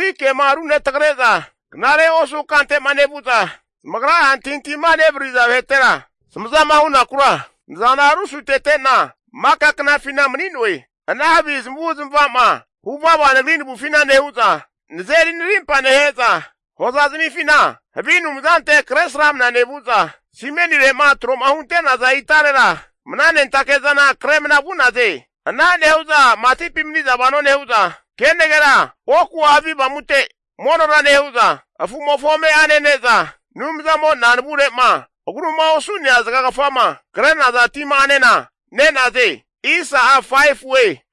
Nagri kema runetrage'za knare osu kante'ma nevu'za, zamagra'a antahintahima nevarariza vahetera zamazama hunakura nazana rusutetena maka knafina mani'noe. Ana havi zamavu zamava'ma huvava Nagri navufina nehu'za, nazeri narimpa nehe'za, hoza zamifina havi anumzante kresramna nevuza, simenire'ma tro'ma hunte'naza itarera mananentake'zana kremna vu'naze. Ana nehu'za matipi maniza vano nehu'za, kenagera oku'a havi avamute monora nehu'za, afu'mofo ame'a nene'za, Anumzamo'na navure'ma agruma osu'nea zagagafama kre'naza tima'anena ne'naze.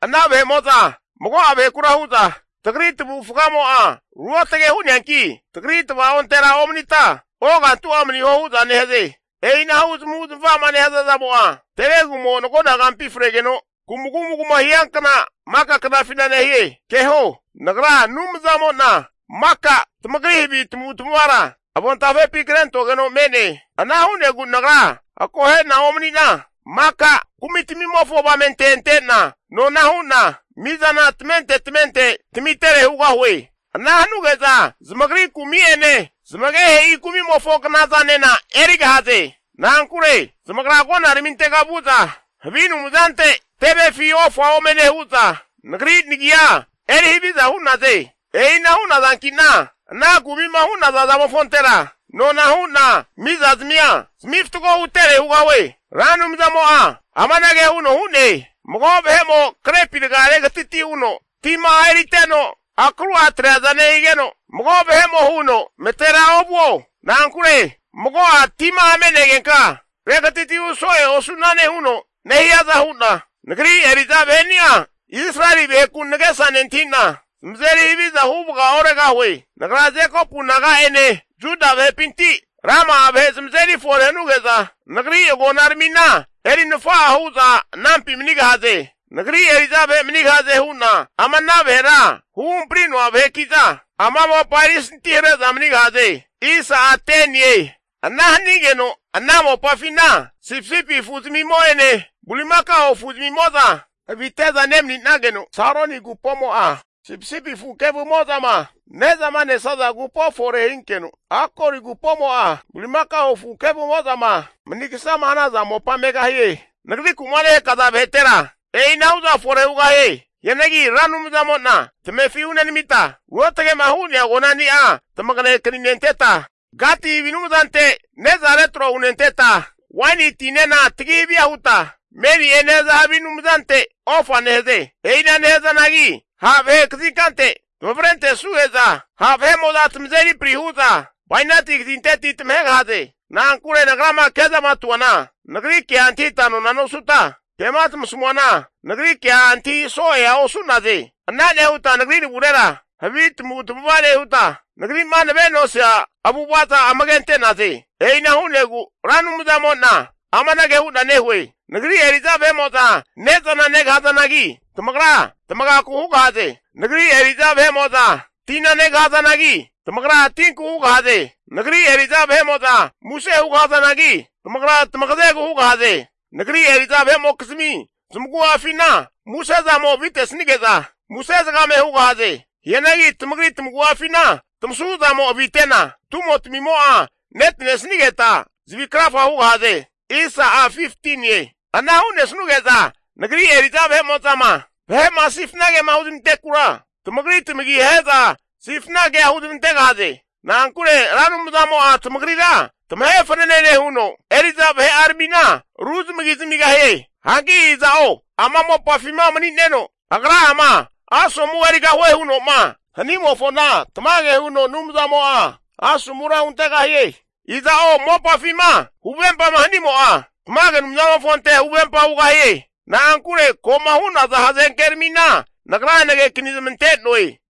Ana vahe'mo'za mago'a vahekura hu'za, tagri tavufgamo'a ruotage hu'neanki, tagri tavaontera omanita ogantu'a maniho hu'za nehaze. E'inahu zamavu zamava'ma nehaza zamo'a tevegumo nagonagampi fregeno kumagumaguma hiankna maka knafina nehie. Keho, Ra Anumzamo'na maka tamagri havi tamavutamavara avontafepi krentogeno me'ne. Ana hu'negu nagra akohe'na omani'na, maka kumitamimofo avamente antena nona hu'na mizana tamente tamente tamitere hugahue. Ana hanuge'za zamagri kumi'ene zamagehe'i kumimofo knazanena erigahaze. Na'ankure zamagra agonaramintega vu'za, havi anumzante tevefi ofa ome nehu'za, nagri nagia eri haviza hu'naze. E'ina hu'nazanki'na ana kumi'ma hu'naza zamofontera, nona hu'na mizazmia zami fatgo hutere hugahue. Ra Anumzamo'a amanage huno hu'ne, Mago vahe'mo krepi raga regatiti huno tima'a eriteno akru'a atreaza nehigeno, mago vahe'mo huno matera ovuo. Na'ankure mago'a tima'a me'negenka regatiti hu so'e osu'nane huno nehiaza hu'na, nagri eri'za vaheni'a Israeli vaheku nagesa nentahi'na zamazeri haviza huvaga oregahue. Nagra Jekopu naga'ene Juda vahepinti rama'a vahe zamazeri fore hanuge'za, nagri agonaramina eri nafa'a hu'za anampi manigahaze. Nagri eri'za vahe manigahaze hu'na ama ana vahera huhampari'noa vaheki'za, ana mopa erisanti hare'za manigahaze. Ana hanigeno ana mopafina sipisipi afu zamimo'ene bulimakao afu'zamimo'za avite'za nemaninageno, Saroni agupomo'a sipisipi afu kevumo'zama ne'zama nesaza agupo fore hinkeno, Akori agupomo'a bulimakao afu kevumo'zama manigasama hanaza mopa megahie. Nagriku'ma nehakaza vahetera e'inahu'za fore hugahie. Hianagi Ra Anumzamo'na tamefi hunenamita, ruotge'ma hu'nea agonani'a tamage akaninenteta, Gati havi anumzante ne'za retro hunenteta waini tinena tagi havia huta Meni'e nehaza havi anumzante ofa nehaze. E'ina nehazanagi ha' vahe kazinkante tamavrentesnuge'za, ha' vahe'mo'za tamazeri pri huza bainati kazinteti tamahegahaze. Na'ankure nagrama kezamatuana nagri kea antahita nona nosuta, kema tamasamuana, nagri kea antahi so'ea osu'naze. Ana nehuta nagri navurera havi tamavu tamavaza nehuta, nagri'ma nave'nosia avu'avaza amage ante'naze. E'ina hu'negu Ra Anumzamo'na amanage hu'na nehue, Nagri eri'za vahe'mo'za ne'zana negahazanagi, tamagra tamagaku hugahaze. Nagri eri'za vahe'mo'za tina negahazanagi, tamagra tinku hugahaze. Nagri eri'za vahe'mo'za muse hugahazanagi, tamagra tamagazegu hugahaze. Nagri eri'za vahe'mokizmi zamagu'afina musezamo avitesanige'za, muse zagame hugahaze. Hianagi tamagri tamagu'afina tamasuzamo avinetena, tumotamimo'a netanesnigeta zavi krafa hugahaze. Ana hu'nesnuge'za Nagri eri'za vahe'mo'zama vahe'ma sifnagema huzmantekura, tamagri tamagi ahe'za sifna kea huzmantegahaze. Na'ankure Ra Anumzamo'a tamagrira tamahe fanene nehuno, eri'za vahe'aramina ru zamagi zamigahie. Hanki iza'o ama mopafima mani'neno, agra'ama asomu erigahue huno'ma hanimofona tamage huno Anumzamo'a asomura huntegahie. Iza'o mopafima huvempama hanimo'a, tamage Anumzamofonte huvempa hugahie. Na'ankure ko'ma hu'naza hazenkeramina Nagra nagekani zamante'noe.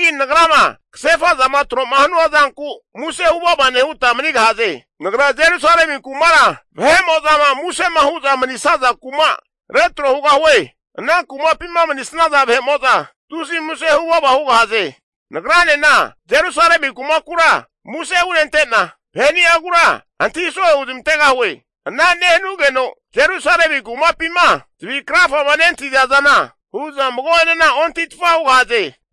Hianagi Nagrama kasefa'zama tro'ma hanua zanku muse huvava nehuta manigahaze. Nagra Jerusalemi kumara vahe'mo'zama musema hu'za manisaza kuma retro hugahue. Ana kumapima manisnaza vahe'mo'za tusi muse huvava hugahaze. Nagranena Jerusalemi kumakura muse hunente'na, vaheni'agura antahi so'e huzmantegahue. Ana nehanugeno Jerusalemi kumapima zavi krafama nentahiza zana hu'za mago'enena ontahitfa hugahaze.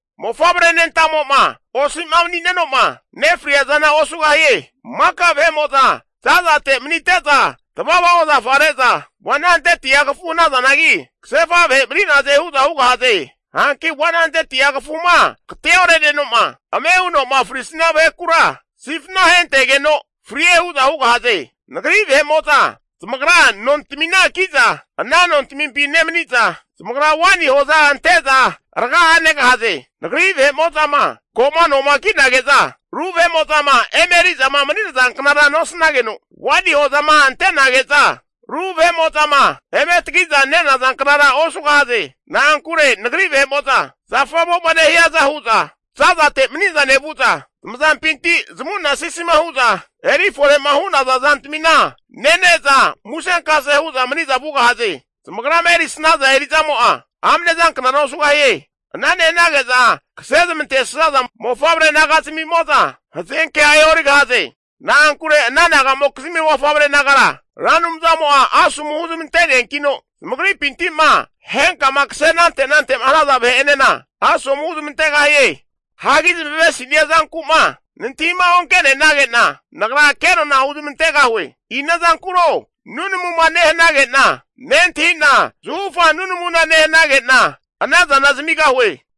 Mofavre nentamo'ma osi'ma mani'neno'ma nefriazana osugahie. Maka vahe'mo'za zazate manite'za tavava ozafa re'za 100'a kafu hanazanagi, kasefa vahe mani'naze hu'za hugahaze. Hanki 100'a kafuma agateore'neno'ma ame huno'ma frisnia vahekura sifna ahentegeno frie hu'za hugahaze. Nagri vahe'mo'za zamagra nontamina ki'za ana nontamimpi nemaniza, zamagra waini hoza ante'za raga'a negahaze. Nagri vahe'mo'zama ko'ma noma kinage'za, ru vahe'mo'zama emerizama mani'nazanknara nosnageno, waini hozama ante'nage'za ru vahe'mo'zama eme tagi'za nenazanknara osugahaze. Na'ankure Nagri vahe'mo'za zafamo'ma nehiaza hu'za zazate maniza nevu'za, zamazampinti zamu'na sisima hu'za eri fore'ma hu'naza zantamina nene'za musenkase hu'za maniza vugahaze. Zamagrama erisnaza eri'zamo'a amne zanknara osugahie. Ana nehanage'za kasezmantesaza mofavre naga'zamimo'za hazenkea e'origahaze. Na'ankure ana naga'mokizmi mofavre nagara Ra Anumzamo'a asomu huzmante'neankino zamagripinti'ma henkama kase anante nante'ma hanaza vahe'enena asomu huzmantegahie. Hagi zamavesinia zanku'ma nantahima onke'nenage'na, Nagra kenona huzmantegahue. Ina zankuro nunamuma nehanage'na nentahi'na, zahufa nunamuna nehanage'na ana zana zamigahue.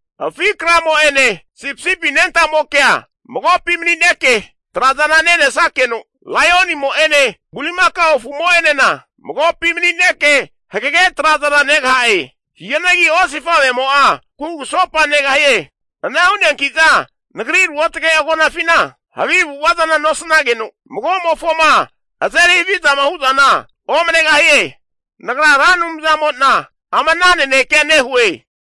Afi kramo'ene sipisipi anentamokea magopi mani'neke trazana nenesakeno, laionimo'ene bulimakao afumo'enena magopi mani'neke hagege trazana negaha'e. Hianagi osifavemo'a kugusopa negahie. Ana hu'neanki'za Nagri ruotage agonafina havi avu'ava zana nosnageno, magomofoma azeri havizama hu'zana omanegahie. Ra Anumzamo'na amana nanekea nehue.